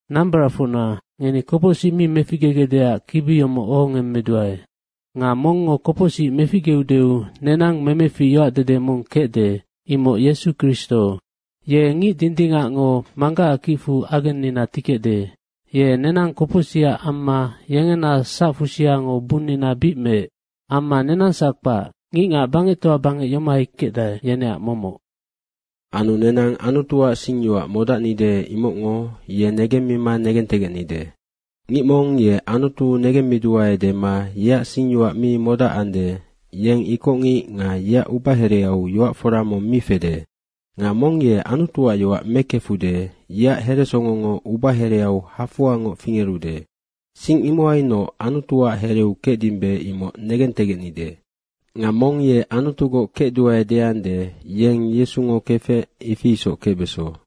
Nambaracfocna, ngeni kopocsic mi megecdeac kibi yomoc ohongemmeduae. Nga mongngo kopocsic meficgeudeu nenang memefic yoacdede mong kecde, imoc Yesu Kristo. Ye ngic dindingacngo Manggacac kicfu agennina tikecde. Ye nenang kopocsicac amma yengena sacfusiango bunnina bic meec. Amma nenangsac kpac, ngicngac bangectoa bangec yomohai kecdae, yeneac momoc. Anu nenang Anutuac singyoac modacnide, imocngo ye negemmima negentegecnide. Ngic mong ye Anutu negemmiduae dema yeac singyoac mi modacande, yeng ikocngic nga yeac ubahereau yoac fora mong mi fede. Nga mong ye Anutuac yoac mekefude, yeac heresongongo ubahereau hafoangoc fingerude. Sing imohainoc Anutuac hereu kecdimbe, imoc negentegecnide. Nga mong ye Anutugoc kecduae deande, yeng Yesungo kefec, ifi isoc kecbeso.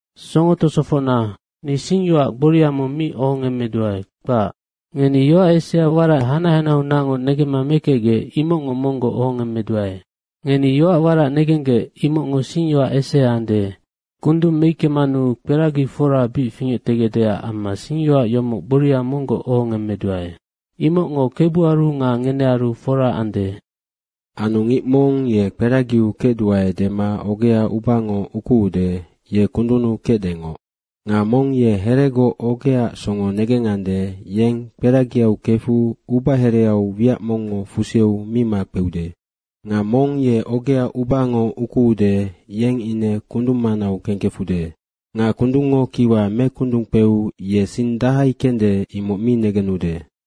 Songo tosofocna, ni singyoac gboria mong mi ohongemmeduae, kpac. Ngeni yoac esea warac hanac hanaheaunacngoc negemma mekecgec, imocngoc monggoc ohongemmeduae. Ngeni yoac warac negenggec, imocngo singyoac esea ande. Kundung meickemanu kperagi fora bic fingectegecdeac amma singyoac yomoc gboria monggoc ohongemmeduae. Imocngo Kebuaru nga ngenearu fora ande. Anu ngic mong ye kperagiau kecduae dema ogea ubango ukuude, ye kundunnu kecdengoc. Nga mong ye heregoc ogeaac songo negengande, yeng kperagiau kefu ubahereau wiac mongngo fuseu mi makpeude. Nga mong ye ogea ubango ukuude, yeng ine kundung manau kengkefude. Nga kundungngo kiwa mekundungkpeu ye sing dahai kende, imoc mi negenude.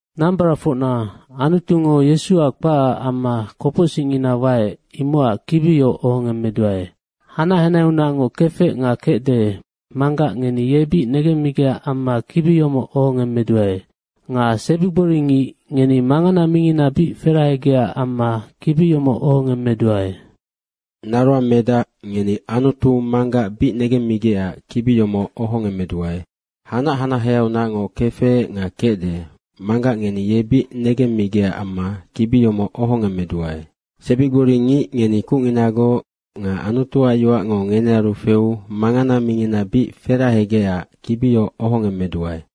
Nambaracfocna Anutungo Yesuac kpacac amma kopocsicngina waec, imocac kibi yoc ohongemmeduae. Hanac hanaheaunacngoc kefec nga kecde, manggac ngeni ye bic negemmigecac amma kibi yomoc ohongemmeduae. Nga sebigbori ngic, ngeni mangana mingina bic ferahegecac amma kibi yomoc ohongemmeduae. Naroangmedac, ngeni Anutu Manggac bic negemmigecac kibi yomoc ohongemmeduae. Hanac hanaheaunacngoc kefec nga kecde, manggac ngeni ye bic negemmigecac amma kibi yomoc ohongemmeduae. Sebigbori ngic, ngeni kucnginagoc nga Anutuac yoacngo ngenearu feu mangana mingina bic ferahegecac kibi yoc ohongemmeduae.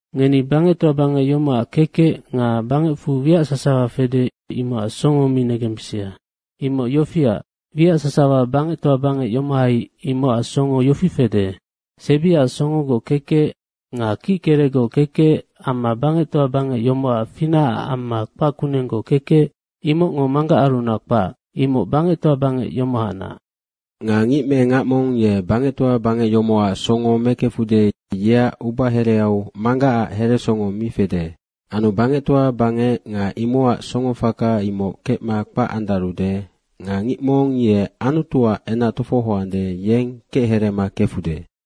Ngeni bangectoa bangec yomocac kekec nga bangecfu wiac sasawa fede, imocac songo mi negembisia. Imoc yofiac, wiac sasawa bangectoa bangec yomohai, imocac songo yofi fede, sebiac songogoc kekec nga kickerecgoc kekec amma bangectoa bangec yomocac finacac amma kpac kunenggoc kekec, imocngo Manggacarunac kpac, imoc bangectoa bangec yomohacnac. Nga ngic me ngac mong ye bangectoa bangec yomocac songo mekefude, yeac ubahereau Manggacac heresongo mi fede. Anu bangectoa bangec nga imocac songofaka, imoc kecma kpac andarude nga ngic mong ye Anutuac enac tofohoande, yeng kechereema kefude.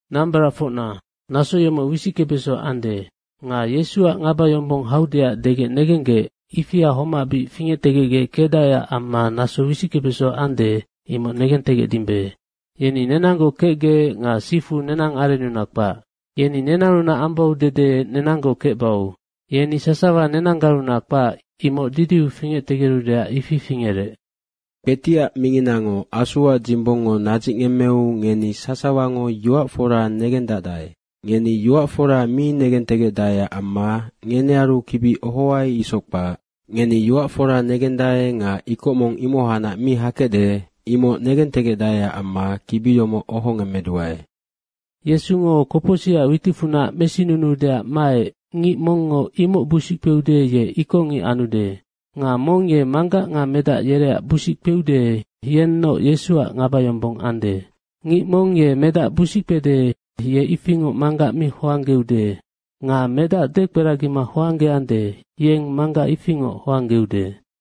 Nambaracfocna, naso yomoc wisickebeso ande. Nga Yesuac ngabayombong haudeac degec negenggec, ifia homac bic fingectegecgec kecdaeac amma naso wisickebeso ande, imoc negentegecdimbe. Yeni nenanggoc kecgec nga sifu nenang arennunac kpac. Yeni nenannunac ambau dede nenanggoc kecbau. Yeni sasawa nenanggarunac kpac, imoc didiu fingectegerudeac, ifi fingerec. Kpetiac minginango Asuac dzimbongngo nadzicngemmeu ngeni sasawango yoac fora negendacdae. Ngeni yoac fora mi negentegecdaeac amma ngenearu kibi ohoai isoc kpac. Ngeni yoac fora negendae nga ikoc mong yoac foraunac mi hakecde, imoc negentegecdaeac amma kibi yomoc ohongemmeduae. Yesungo kopocsicac witicfunac mesinunuudeac maec, ngic mongngo imoc busic kpeude, ye ikocngic anude. Nga mong ye Manggac nga Medac yereac busic kpeude, yennoc Yesuac ngabayombong anude. Ngic mong ye Medac busickpede, ye ifingoc Manggac mi hoanggeude. Nga Medac dekperagima hoanggeande, yeng Manggac ifingoc hoanggeude.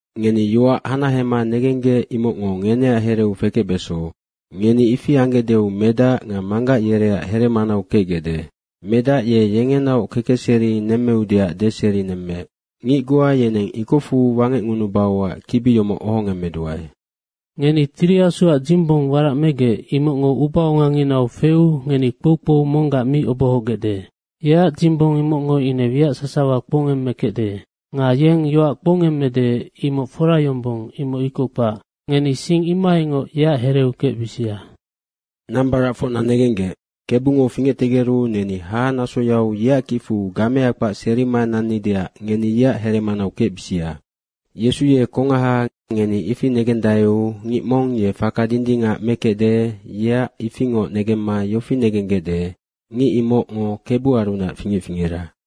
Ngeni yoac hanahema negenggec, imocngo ngeneac hereu fekecbeso. Ngeni ifi anggecdeu Medac nga Manggac yereac heremanau kecgecde. Medac ye yengenaoc kekecserinoc nemmeudeac deserinemmeec. Ngic goa yeneng ikocfu wangecngunubauac kibi yomoc ohongemmeduae. Ngeni Tiri Asuac dzimbong warac megec, imocngo ubaonganginau feu ngeni kpoukpou monggac mi obohogecde. Yeac dzimbong imocngo ine wiac sasawa kpoungemmekecde. Nga yeng yoac kpoungemmede, imoc fora yombong, imoc ikoc kpac. Ngeni sing imohaingoc yeac hereu kecbisia. Nambaracfocna negenggec, Kebungo fingectegeru neni hahanasoyau yeac kicfu gamea kpac serima nannideac ngeni yeac heremanau kecbisia. Yesu ye kongaha, ngeni ifi negengandaeu ngic mong ye faka dindingac mekecde, yeac ifingoc negemma yofi negenggecde, ngic imocngo Kebuarunac fingec fingera.